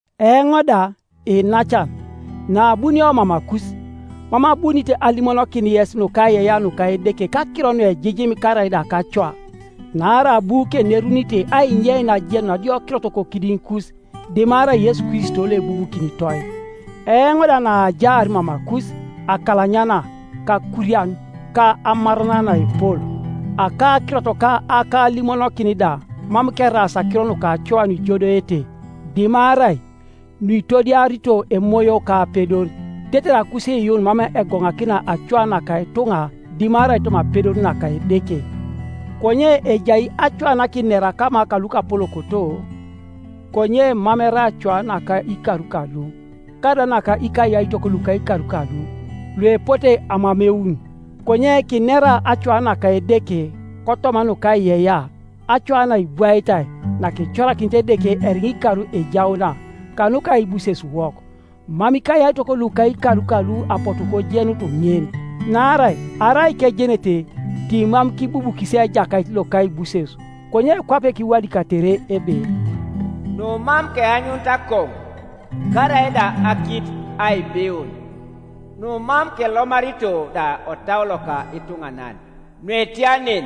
Eoŋ da, iinacan, naabunio mamakus, mam abunit alimonokin yes nukaiyeiyea nuka Edeke kakiro nuejijim karaida kacoa. Naarai abu kenerunite ainyein ajenun adiokirot kokidiŋikus, dimarai Yesu Kristo loebubukinitoi. Eoŋ da naajaar mamakus, akalanyana, kakurian ka amaran naepol; akakirot ka akalimonokin da mam keraas akiro nukacoa nuijodoete, dimarai nuitodiarito Emoyo ka apedor, tetere akusiiyuun mam egoŋakina acoa naka ituŋa dimarai toma apedor naka Edeke. Konye ejai acoa nakinera kama kaluapolokoto konye mam erai acoa naka ikar kalu, karaida naka ikayaitok luka ikar kalu, luepote amameun, konye kinera acoa naka Edeke kotoma nukaiyeiyea, acoa naibwaitai, nakicorakinit Edeke eriŋa ikar ejauna, kanuka aibusesuwok. Mam ikayaitok luka ikar kalu apotu kojenut ŋin; naarai arai kejenete timam kibubukis Ejakait lokaibuses. Konye kwape kiwadikatere ebe, “Numam keanyunit akoŋu, karaida akit aibiun, Numam kelomarito da otau loka ituŋanan Nuetia nen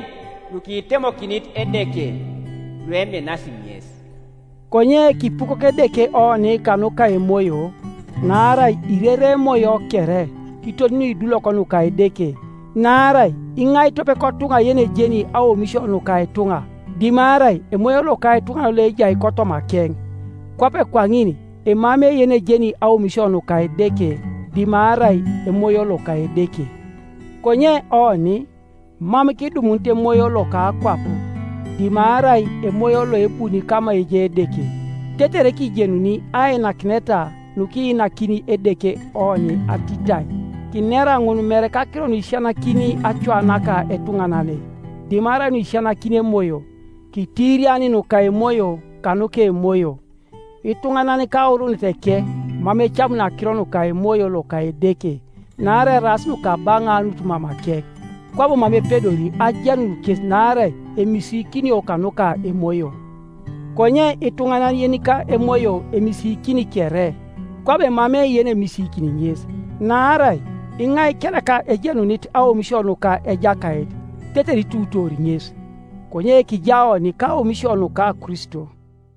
nukitemokinit Edeke lueminasi ŋes.” Konye kipukok Edeke oni kanuka Emoyo. Naarai irerei Emoyo kere, kiton nuidulok nuka Edeke. Naarai iŋai tope kotuŋa yenejeni aomisio nuka ituŋa, dimarai emoyo loka ituŋanan loejai kotomakeŋ? Kwape kwaŋin emamei yenejeni aomisio nuka Edeke dimarai Emoyo loka Edeke. Konye oni, mam kidumunit emoyo loka akwap, dimarai Emoyo loebuni kama ejai Edeke, tetere kijenuni ainakineta nukiinakini Edeke oni atitai. Kinera ŋun mere kakiro nuisisianakini acoa naka etuŋanane, dimarai nuisisianakini Emoyo, kitiiriani nuka emoyo kanuka emoyo. Ituŋanan kauruuneteke mam ecamuni akiro nuka Emoyo loka Edeke, naarai eraas nukabaŋaanut mamakeŋ, kwabo mam epedori ajenun kes naarai emisiikinio kanuka emoyo. Konye ituŋanan yenika emoyo emisiikini kere, kwabo emamei yenemisiikini ŋes. “Naarai iŋai kereka ejenunit aomisio nuka Ejakait, tetere ituutoori ŋes?” Konye kijaa oni kaomisio nuka Kristo.